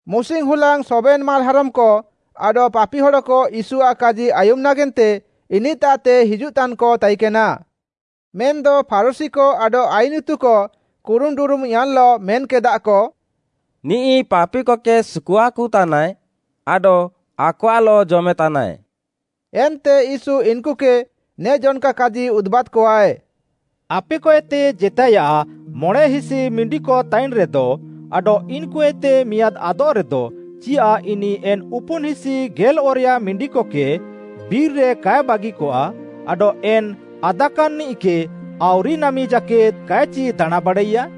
ମୁସିଙ୍ଗ୍‌ ହୁଲାଙ୍ଗ୍‌ ସବେନ୍‌ ମାଲ୍‌ହାରମ୍‌କ ଆଡଃ ପାପି ହଡ଼କ ୟୀଶୁଆଃ କାଜି ଆୟୁମ୍‌ ନାଗେନ୍ତେ ଇନିଃତାଃତେ ହିଜୁଃତାନ୍‌କ ତାଇକେନା। ମେନ୍‌ଦ ଫାରୁଶୀକ ଆଡଃ ଆଇନ୍‌ ଇତୁକ କୁରୁମ୍‌ଡୁରୁମ୍‌ୟାନ୍‌ଲଃ ମେନ୍‌କେଦାଃକ, “ନିଃ ପାପିକକେ ସୁକୁଆକୁତାନାଏ ଆଡଃ ଆକଆଃଲଃ ଜମେତାନାଏ।” ଏନ୍ତେ ୟୀଶୁ ଇନ୍‌କୁକେ ନେ ଜନ୍‌କା କାଜି ଉଦୁବାଦ୍‌କଆଏ। “ଆପେକଏତେ ଜେତାଏୟାଃ ମଣେଁହିସି ମିଣ୍ଡିକ ତାଇନ୍‌ରେଦ ଆଡଃ ଇନ୍‌କୁଏତେ ମିଆଁଦ୍‌ ଆଦଃରେଦ ଚିୟାଃ ଇନିଃ ଏନ୍‌ ଉପୁନ୍‌ହିସି ଗେଲ୍‌ଅରେୟା ମିଣ୍ଡିକକେ ବିର୍‌ରେ କାଏ ବାଗିକଆ ଆଡଃ ଏନ୍‌ ଆଦାକାନ୍‌ନିଃକେ ଆଉରିନାମି ଜାକେଦ୍‌ କାଏଚି ଦାଣାଁଁବାଡ଼ାଇୟା?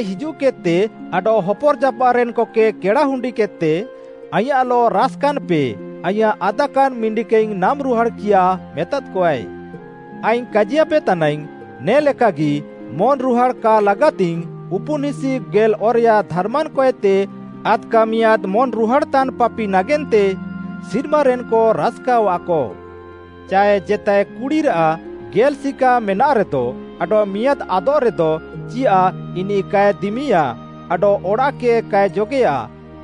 ଆଡଃ ଅଡ଼ାଃତେ ହିଜୁଃକେଦ୍‌ତେ ଆୟାଃ ଗାତିକକେ ଆଡଃ ହପର୍‌ଜାପାଃରେନ୍‌କକେ କେଡ଼ାହୁଣ୍ଡିକେଦ୍‌ତେ ‘ଆଇଁୟାଃଲଃ ରାସ୍‌କାନ୍‌ପେ, ଆଇଁୟାଃ ଆଦାକାନ୍‌ ମିଣ୍ଡିକେଇଙ୍ଗ୍‌ ନାମ୍‌ରୁହାଡ଼୍‌କିୟା’ ମେତାକଆଏ। ଆଇଙ୍ଗ୍‌ କାଜିୟାପେ ତାନାଇଙ୍ଗ୍‌, ନେ ଲେକାଗି ମନ୍‌ରୁହାଡ଼୍‌ କା ଲାଗାତିଙ୍ଗ୍‌ ଉପୁନ୍‌ହିସି ଗେଲ୍‌ଅରେୟା ଧାର୍‌ମାନ୍‌କଏତେ ଆଦ୍‌କା ମିଆଁଦ୍‌ ମନ୍‌ରୁହାଡ଼୍‌ତାନ୍‌ ପାପି ନାଗେନ୍ତେ ସିର୍ମାରେନ୍‌କ ରାସ୍‌କାଅଆଃକ। “ଚାଏ ଜେତାଏ କୁଡ଼ିରାଃ ଗେଲ୍‌ ସିକା ମେନାଃରେଦ ଆଡଃ ମିଆଁଦ୍‌ ଆଦଃରେଦ, ଚିୟାଃ ଇନିଃ କାଏ ଦିମିୟା ଆଡଃ ଅଡ଼ାଃକେ କାଏ ଜଗେୟା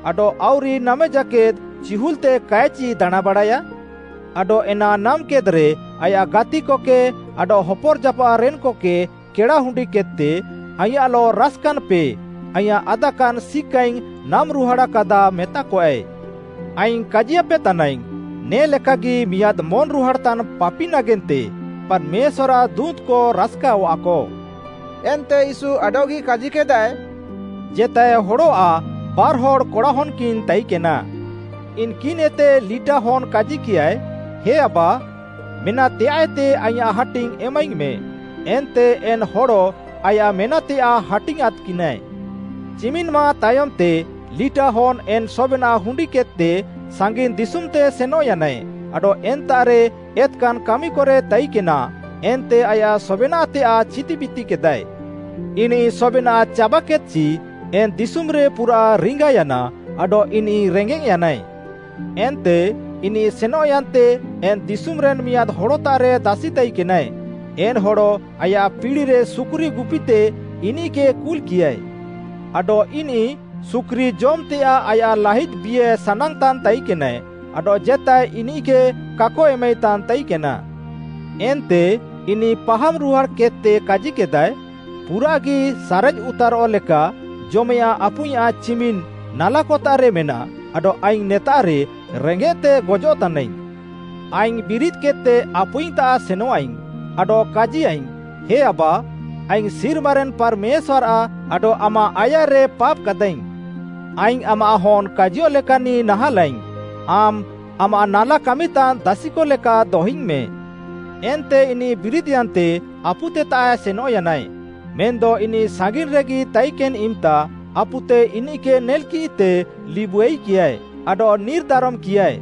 ଆଡଃ ଆଉରି ନାମେଜାକେଦ୍‌ ଚିହୁଲ୍‌ତେ କାଏଚି ଦାଣାଁଁବାଡ଼ାୟା? ଆଡଃ ଏନା ନାମ୍‌କେଦ୍‌ରେ ଆୟାଃ ଗାତିକକେ ଆଡଃ ହପର୍‌ଜାପାଃରେନ୍‌କକେ କେଡ଼ାହୁଣ୍ଡିକେଦ୍‌ତେ, ଆଇଁୟାଃଲଃ ରାସ୍‌କାନ୍‌ପେ, ଆଇଁୟାଃ ଆଦାକାନ୍‌ ସିକାଇଙ୍ଗ୍‌ ନାମ୍‌ରୁହାଡ଼୍‌କାଦା ମେତାକଆଏ। ଆଇଙ୍ଗ୍‌ କାଜିୟାପେ ତାନାଇଙ୍ଗ୍‌, ନେ ଲେକାଗି ମିଆଁଦ୍‌ ମନ୍‌ରୁହାଡ଼୍‌ତାନ୍‌ ପାପି ନାଗେନ୍ତେ ପାର୍‌ମେଶ୍ୱାର୍‌ଆଃ ଦୁଁତ୍‌କ ରାସ୍‌କାଅଆଃକ।” ଏନ୍ତେ ୟୀଶୁ ଆଡଃଗି କାଜିକେଦାଏ, “ଜେତାଏ ହଡ଼ଆଃ ବାର୍‌ହଡ଼୍‌ କଡ଼ାହନ୍‌କିନ୍‌ ତାଇକେନା। ଇନ୍‌କିନ୍‌ଏତେ ଲିଟା ହନ୍‌ କାଜିକିୟାଏ, ‘ହେ ଆବା, ମେନାଃତେୟାଃଏତେ ଆଇଁୟାଃ ହାଟିଙ୍ଗ୍‌ ଏମାଇଙ୍ଗ୍‌ମେ।’ ଏନ୍ତେ ଏନ୍‌ ହଡ଼ ଆୟାଃ ମେନାଃତେୟାଃ ହାଟିଙ୍ଗ୍‌ଆଁଦ୍‌କିନାଏ। ଚିମିନ୍‌ ମାଃ ତାୟମ୍‌ତେ ଲିଟା ହନ୍‌ ଏନ୍‌ ସବେନାଃ ହୁଣ୍ଡିକେଦ୍‌ତେ ସାଙ୍ଗିନ୍‌ ଦିଶୁମ୍‌ତେ ସେନଃୟାନାଏ ଆଡଃ ଏନ୍ତାଃରେ ଏତ୍‌କାନ୍‌ କାମିକରେ ତାଇକେନା ଏନ୍ତେ ଆୟାଃ ସବେନାଃତେୟାଃ ଛିତିବିତିକେଦାଏ। ଇନିଃ ସବେନାଃ ଚାବାକେଦ୍‌ଚି, ଏନ୍‌ ଦିଶୁମ୍‌ରେ ପୁରାଃ ରିଙ୍ଗାୟାନା ଆଡଃ ଇନିଃ ରେଙ୍ଗେଃୟାନାଏ। ଏନ୍ତେ ଇନିଃ ସେନଃୟାନ୍ତେ ଏନ୍‌ ଦିଶୁମ୍‌ରେନ୍‌ ମିଆଁଦ୍‌ ହଡ଼ତାଃରେ ଦାସିତାଇକେନାଏ, ଏନ୍‌ ହଡ଼ ଆୟାଃ ପିଡ଼ିରେ ସୁକୁରି ଗୁପିତେ ଇନିଃକେ କୁଲ୍‌କିୟାଏ। ଆଡଃ ଇନିଃ ସୁକୁରି ଜମ୍‌ତେୟାଃ ଆୟାଃ ଲାହିଦ୍‌ ବିଏ ସାନାଙ୍ଗ୍‌ତାନ୍ ତାଇକେନାଏ ଆଡଃ ଜେତାଏ ଇନିଃକେ କାକ ଏମାଇତାନ୍‌ ତାଇକେନା। ଏନ୍ତେ ଇନିଃ ପାହାମ୍‌ ରୁହାଡ଼୍‌କେଦ୍‌ତେ କାଜିକେଦାଏ, ପୁରାଃଗି ସାରେଜ୍‌ଉତାରଃ ଲେକା ଜମେୟାଃଁ ଆପୁଇଁୟାଃ ଚିମିନ୍‌ ନାଲାକତାଃରେ ମେନାଃ ଆଡଃ ଆଇଙ୍ଗ୍‌ ନେତାଃରେ ରେଙ୍ଗେଃତେ ଗଜଃତାନାଇଙ୍ଗ୍‌। ଆଇଙ୍ଗ୍‌ ବିରିଦ୍‌କେଦ୍‌ତେ ଆପୁଇଙ୍ଗ୍‌ତାଃ ସେନଃଆଇଙ୍ଗ୍‌ ଆଡଃ କାଜିୟାଇଙ୍ଗ୍‌, ହେ ଆବା, ଆଇଙ୍ଗ୍‌ ସିର୍ମାରେନ୍‌ ପାର୍‌ମେଶ୍ୱାର୍‌ଆଃ ଆଡଃ ଆମାଃ ଆୟାର୍‌ରେ ପାପ୍‌କାଦାଃଇଙ୍ଗ୍‌। ଆଇଙ୍ଗ୍‌ ଆମାଃ ହନ୍‌ କାଜିୟଃଲେକାନିଃ ନାହାଁଲାଇଙ୍ଗ୍‌, ଆମ୍‌ ଆମାଃ ନାଲା କାମିତାନ୍‌ ଦାସିକ ଲେକା ଦହିଙ୍ଗ୍‌ମେଁ। ଏନ୍ତେ ଇନିଃ ବିରିଦ୍‌ୟାନ୍ତେ ଆପୁତେତାଃ ସେନଃୟାନାଏ। ମେନ୍‌ଦ ଇନିଃ ସାଙ୍ଗିନ୍‌ରେଗି ତାଇକେନ୍‌ ଇମ୍‌ତା ଆପୁତେ ଇନିଃକେ ନେଲ୍‌କିଃତେ ଲିବୁଆଇକିୟାଏ, ଆଡଃ ନିର୍‌ ଦାରମ୍‌କିୟାଏ,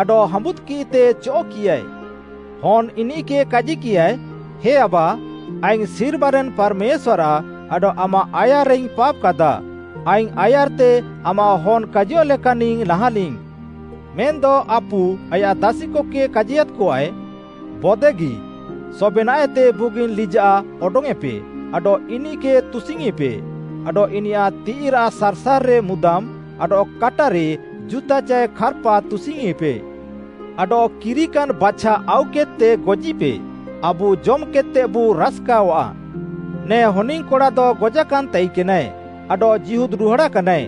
ଆଡଃ ହାଁବୁଦ୍‌କିଃତେ ଚଅଃ'କିୟାଏ। ହନ୍‌ ଇନିଃକେ କାଜିକିୟାଏ, ‘ହେ ଆବା, ଆଇଙ୍ଗ୍‌ ସିର୍ମାରେନ୍‌ ପାର୍‌ମେଶ୍ୱାର୍‌ଆଃ ଆଡଃ ଆମାଃ ଆୟାର୍‌ରେଇଙ୍ଗ୍‌ ପାପ୍‌କାଦାଃ, ଆଇଙ୍ଗ୍‌ ଆୟାର୍‌ତେ ଆମାଃ ହନ୍‌ କାଜିୟଃଲେକାନିଃ ନାହାଁଲିଙ୍ଗ୍‌।’ ମେନ୍‌ଦ ଆପୁ ଆୟାଃ ଦାସିକକେ କାଜିୟାଦ୍‌କଆଏ, ‘ବୋଦେଗି! ସବେନାଃଏତେ ବୁଗିନ୍‌ ଲିଜାଃ ଅଡଙ୍ଗ୍‌ୟେଁପେ ଆଡଃ ଇନିଃକେ ତୁସିଙ୍ଗ୍‌ଇପେ ଆଡଃ ଇନିୟାଃ ତିଃଇରାଃ ସାର୍‌ସାର୍‌ରେ ମୁଦାମ୍‌ ଆଡଃ କାଟାରେ ଜୁତା ଚାଏ ଖାର୍‌ପା ତୁସିଙ୍ଗ୍‌ଇପେ। ଆଡଃ କିରିକାନ୍‌ ବାଛା ଆଉକେଦ୍‌ତେ ଗଜିପେ, ଆବୁ ଜମ୍‌କେଦ୍‌ତେବୁ ରାସ୍‌କାଅଃଆ। ନେ ହନିଙ୍ଗ୍‌କଡ଼ାଦ ଗଜାକାନ୍‌ ତାଇକେନାଏ ଆଡଃ ଜୀହୁଦ୍‌ରୁହାଡ଼ାକାନାଏ,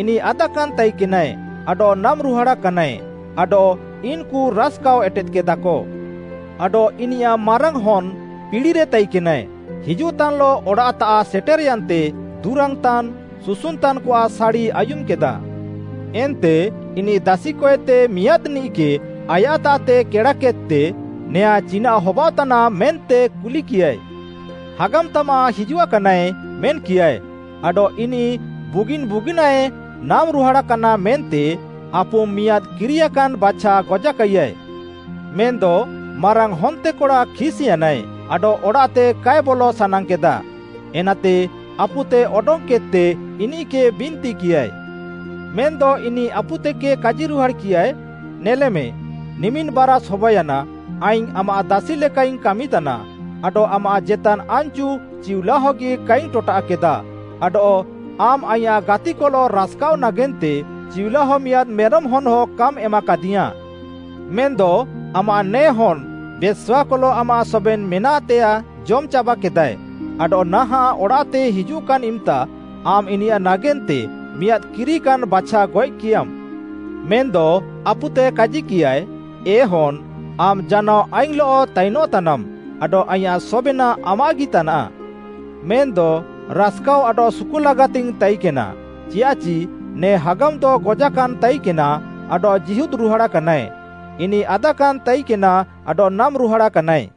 ଇନିଃ ଆଦାକାନ୍‌ ତାଇକେନାଏ ଆଡଃ ନାମ୍‌ରୁହାଡ଼ାକାନାଏ, ଆଡଃ ଇନ୍‌କୁ ରାସ୍‌କାଅଃ ଏଟେଦ୍‌କେଦାକ।’ “ଆଡଃ ଇନିୟାଃ ମାରାଙ୍ଗ୍‌ ହନ୍‌ ପିଡ଼ିରେ ତାଇକେନାଏ, ହିଜୁଃତାନ୍‌ଲଃ ଅଡ଼ାଃତାଃ ସେଟେର୍‌ୟାନ୍‌ତେ ଦୁରାଙ୍ଗ୍‌ତାନ୍‌, ସୁସୁନ୍‌ତାନ୍‌କଆଃ ସାଡ଼ି ଆୟୁମ୍‌କେଦା। ଏନ୍ତେ ଇନିଃ ଦାସିକଏତେ ମିଆଁଦ୍‌ନିଃକେ ଆୟାଃତାଃତେ କେଡ଼ାକେଦ୍‌ତେ ‘ନେଆଁଁ ଚିନାଃ ହବାଅଃତାନାଃ’ ମେନ୍ତେ କୁଲିକିୟାଏ। ‘ହାଗାମ୍‌ ତାମାଃ ହିଜୁଆକାନାଏ’ ମେନ୍‌କିୟାଏ, ‘ଆଡଃ ଇନିଃ ବୁଗିନ୍‌ ବୁଗିନାଏ ନାମ୍‌ରୁହାଡ଼ାକାନା ମେନ୍ତେ ଆପୁମ୍‌ ମିଆଁଦ୍‌ କିରିୟାକାନ୍‌ ବାଛା ଗଜାକାଇୟାଏ।’ “ମେନ୍‌ଦ ମାରାଙ୍ଗ୍‌ ହନ୍ତେକଡ଼ା ଖିସ୍‌ୟାନାଏ ଆଡଃ ଅଡ଼ାଃତେ କାଏ ବଲ ସାନାଙ୍ଗ୍‌କେଦା, ଏନାତେ ଆପୁତେ ଅଡଙ୍ଗ୍‌କେଦ୍‌ତେ ଇନିଃକେ ବିନ୍ତିକିୟାଏ। ମେନ୍‌ଦ ଇନିଃ ଆପୁତେକେ କାଜିରୁହାଡ଼୍‌କିୟାଏ, ‘ନେଲେମେ, ନିମିନ୍‌ ବାରାଷ୍‌ ହବାୟାନା ଆଇଙ୍ଗ୍‌ ଆମାଃ ଦାସି ଲେକାଇଙ୍ଗ୍‌ କାମିତାନା ଆଡଃ ଆମାଃ ଜେତାନ୍‌ ଆନ୍‌ଚୁ ଚିଉଲାହଗି କାଇଙ୍ଗ୍‌ ଟଟାଃକେଦା ଆଡଃ ଆମ୍‌ ଆଇଁୟାଃ ଗାତିକଲଃ ରାସ୍‌କାଃଅ ନାଗେନ୍ତେ ଚିଉଲାହ ମିଆଁଦ୍‌ ମେରମ୍‌ ହନ୍‌ହଁ କାମ୍‌ ଏମାକାଦିଇୟାଁଃ। ମେନ୍‌ଦ ଆମାଃ ନେ ହନ୍‌ ବେଶ୍ୱାକଲଃ ଆମାଃ ସବେନ୍‌ ମେନାଃତେୟାଃ ଜମ୍‌ଚାବାକେଦାଏ, ଆଡଃ ନାହାଁଃ ଅଡ଼ାଃତେ ହିଜୁଃକାନ୍‌ ଇମ୍‌ତା ଆମ୍‌ ଇନିୟାଃ ନାଗେନ୍ତେ ମିଆଁଦ୍‌ କିରିକାନ୍‌ ବାଛା ଗଏଃକିୟାମ୍‌।’ ମେନ୍‌ଦ ଆପୁତେ କାଜିକିୟାଏ, ‘ହେ ହନ୍‌, ଆମ୍‌ ଜାନାଅ ଆଇଙ୍ଗ୍‌ଲଃ ତାଇନଃତାନାମ୍‌ ଆଡଃ ଆଇଁୟାଃ ସବେନାଃ ଆମାଃଗି ତାନାଃ। ମେନ୍‌ଦ ରାସ୍‌କାଅଃ ଆଡଃ ସୁକୁଅଃଲାଗାତିଙ୍ଗ୍‌ ତାଇକେନା ଚିୟାଃଚି ନେ ହାଗାମ୍‌ଦ ଗଜାକାନାଏ ତାଇକେନା ଆଡଃ ଜୀହୁଦ୍‌ରୁହାଡ଼ାକାନାଏ; ଇନିଃ ଆଦାକାନାଏ ତାଇକେନା ଆଡଃ ନାମ୍‌ରୁହାଡ଼ାକାନାଏ।’”